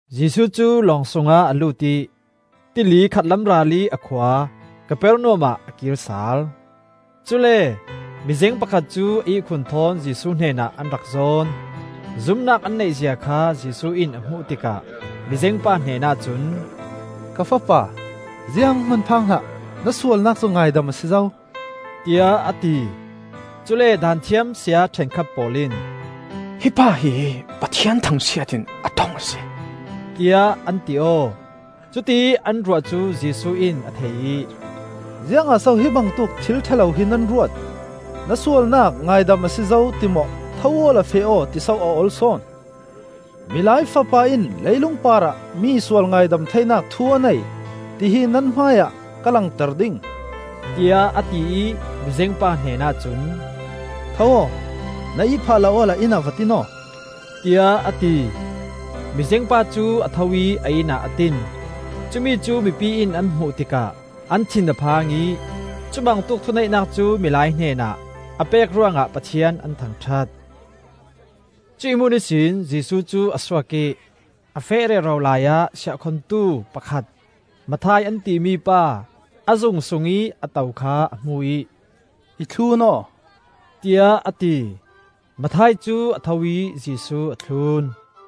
Jesuh cu lawng sungah a lut ih tili khatlam ralih a khua Kapernaum ah a kir sal. Cule mizeng pakhat cu a ihkhun thawn Jesuh hnenah an rak zawn. Zumnak an neihzia kha Jesuh in a hmuh tikah, mizengpa hnenah cun, “Ka fapa, zianghman phang hlah. Na sualnak cu ngaidam a si zo,” tiah a ti. Cule Daanthiam saya ṭhenkhat pawl in, “Hi pa hi Pathian thangsiat in a ṭong a si,” tiah an ti aw. Cutiih an ruah cu Jesuh in a thei ih, “Ziangah so hi bangtuk thil ṭha lo hi nan ruat? ‘Na sualnak cu ngaidam a si zo,’ ti maw ‘Tho awla feh aw,’ ti so a ol sawn? Milai Fapa in leilung parah mi sual ngaidam theinak thu a nei, tihi nan hmaiah ka langter ding,” tiah a ti ih mizengpa hnenah cun, “Tho aw, na ihphah la awla inn ah va tin aw,” tiah a ti. Mizengpa cu a tho ih a inn ah a tin. Cumi cu mipi in an hmuh tikah an thin a phang ih cubangtuk thuneihnak cu milai hnenah a pek ruangah Pathian an thangṭhat. Cuih hmun ihsin Jesuh cu a suak ih a feh rero laiah siahkhongtu pakhat Matthai an timi pa a zung sungih a to kha a hmu ih, “I thlun aw,” tiah a ti. Matthai cu a tho ih Jesuh a thlun.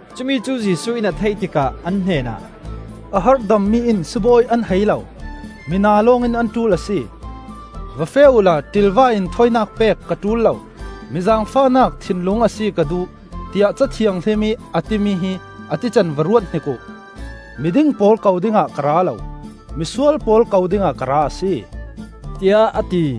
Cumi cu Jesuh in a theih tikah an hnenah, “A harhdammi in sibawi an hai lo, mina lawngin an ṭul a si. Va feh uhla, ‘ṭilva in thawinak pek ka ṭul lo, mi zaangfahnak thinlung a si ka duh,’ tiah Ca Thianghlim ih a timi hi a tican va ruathnik uh. Miding pawl ko dingah ka ra lo, misual pawl ko dingah ka ra a si,” tiah a ti.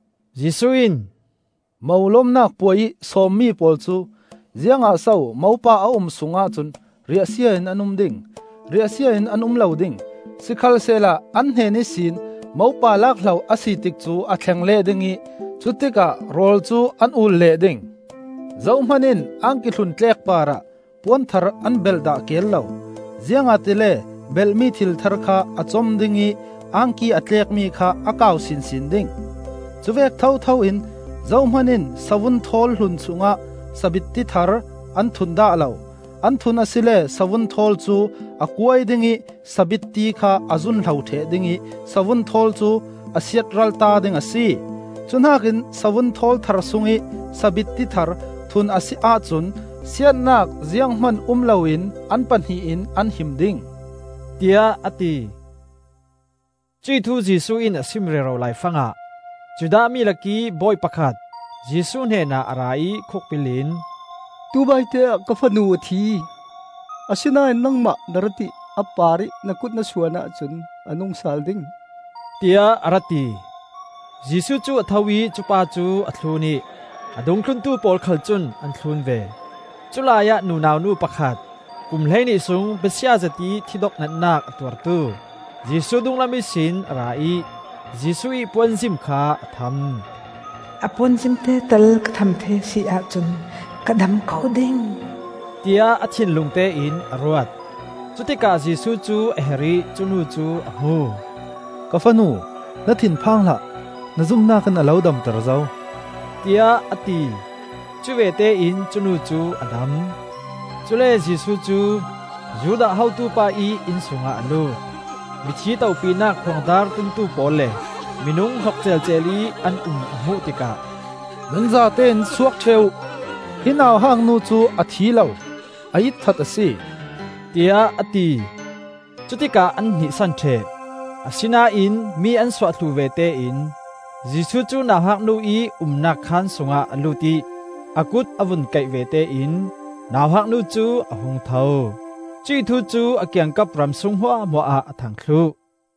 Jesuh in, “Mo lomnak puai ih sawmmi pawl cu ziangah so mopa a um sungah cun riahsia in an um ding? Riahsia in an um lo ding! Sikhalsehla an hnen ihsin mopa lakhlo a si tikcu a thleng leh ding ih cutikah rawl cu an ul leh ding. “Zohman in angki hlun tlek parah puan thar an belh dah keel lo, ziangahtile belhmi thil thar kha a com ding ih angki a tlekmi kha a kau sinsin ding. Cuvek thotho in zohman in savun thawl hlun sungah sabitti thar an thun dah lo; an thun asile savun thawl cu a kuai ding ih sabitti kha a zun hlo ṭheh ding ih savun thawl cu a siatralta ding a si. Cu hnakin savun thawl thar sungih sabitti thar thun a si ahcun siatnak ziang hman um loin an pahnih in an him ding,” tiah a ti. Cuih thu Jesuh in a sim rero laifangah Judah mi lakih bawi pakhat Jesuh hnenah a ra ih khukbil in, “Tubaite ah ka fanu a thi. Asinain nangmah na rat ih a parih na kut na suan ahcun a nung sal ding,” tiah a ra ti. Jesuh cu a tho ih cu pa cu a thlun ih a dungthluntu pawl khal cun an thlun ve. Culai ah nunau nu pakhat kum hleihnih sung besia zetih thidok natnak a tuartu Jesuh dunglam ihsin a ra ih Jesuh ih puanzim kha a tham. “A puan zimte tal ka tham thei a si ahcun ka dam ko ding,” tiah a thinlungte in a ruat. Cutikah Jesuh cu a her ih cu nu cu a hmu. “Ka fanu, na thinphang hlah! Na zumnak in a lo damter zo,” tiah a ti. Cuvete in cu nu cu a dam. Cule Jesuh cu Judah hotupa ih inn sungah a lut. Mithi topinak khuangdar tumtu pawl le minung hnok ceelceel ih an um a hmuh tikah, “Nan zatein suak ṭheh uh! Hi nauhak nu cu a thi lo, a itthat a si,” tiah a ti. Cutikah an hnihsan ṭheh. Asinain mi an suah thluh vete in Jesuh cu nauhak nu ih umnak khaan sungah a lut ih a kut a vun kaih vete in nauhak nu cu a hung tho. Cuih thu cu a kiangkap ram sung hmuahhmuah ah a thang thluh.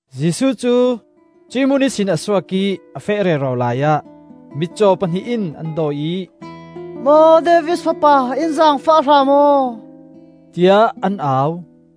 Jesuh cu cuih hmun ihsin a suak ih a feh rero laiah mitcaw pahnih in an dawi ih, “Maw David Fapa, in zaangfah hram aw,” tiah an au.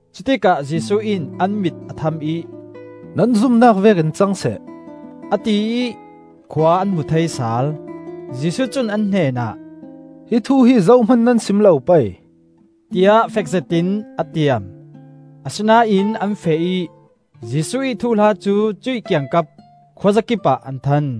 Cutikah Jesuh in an mit a tham ih, “Nan zumnak vekin cang seh,” a ti ih, khua an hmu thei sal. Jesuh cun an hnenah, “Hi thu hi zohman nan sim lo pei,” tiah fek zetin a tiam. Asinain an feh ih Jesuh ih thuhla cu cuih kiangkap khuazakipah an than.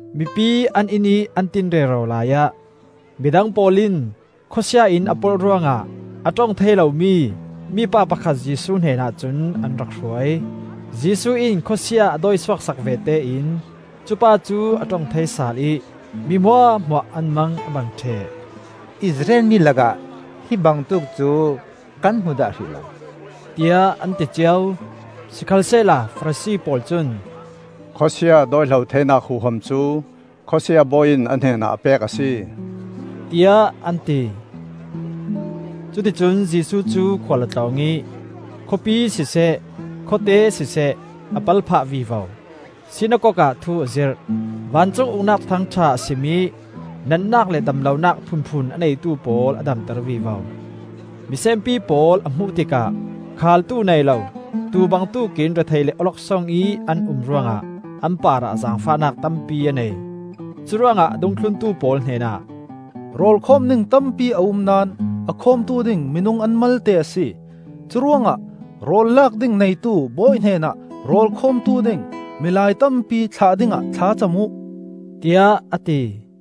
Mipi an inn ih an tin rero laiah midang pawl in khawsia in a polh ruangah a ṭong thei lomi mipa pakhat Jesuh hnenah cun an rak hruai. Jesuh in khawsia a dawi suak sak vete in cupa cu a ṭong thei sal ih mi hmuahhmuah an mang a bang ṭheh. “Israel mi lakah hi bangtuk cu kan hmu dah hrih lo,” tiah an ti cio. Sikhalsehla Farasi pawl cun, “Khawsia dawihlo theinak huham cu khawsia bawi in a hnenah a pek a si,” tiah an ti. Cuticun Jesuh cu khual a tlawng ih khawpi siseh, khawte siseh, a pal phah vivo. Sinakok ah thu a zirh, vancung Uknak Thuthang ṭha a sim ih natnak le damlonak phunphun a neitu pawl a damter vivo. Misenpi pawl a hmuh tikah khaaltu nei lo tuu bangtuk in rethei le awloksong ih an um ruangah an parah zaangfahnak tampi a nei. Curuangah a dungthluntu pawl hnen ah, “Rawl khawm ding tampi a um naón a khawmtu ding minung an malte a si. Curuangah rawl lak ding neitu bawi hnen ah rawl khawmtu ding milai tampi thlah dingah thlacam uh,” tiah a ti. te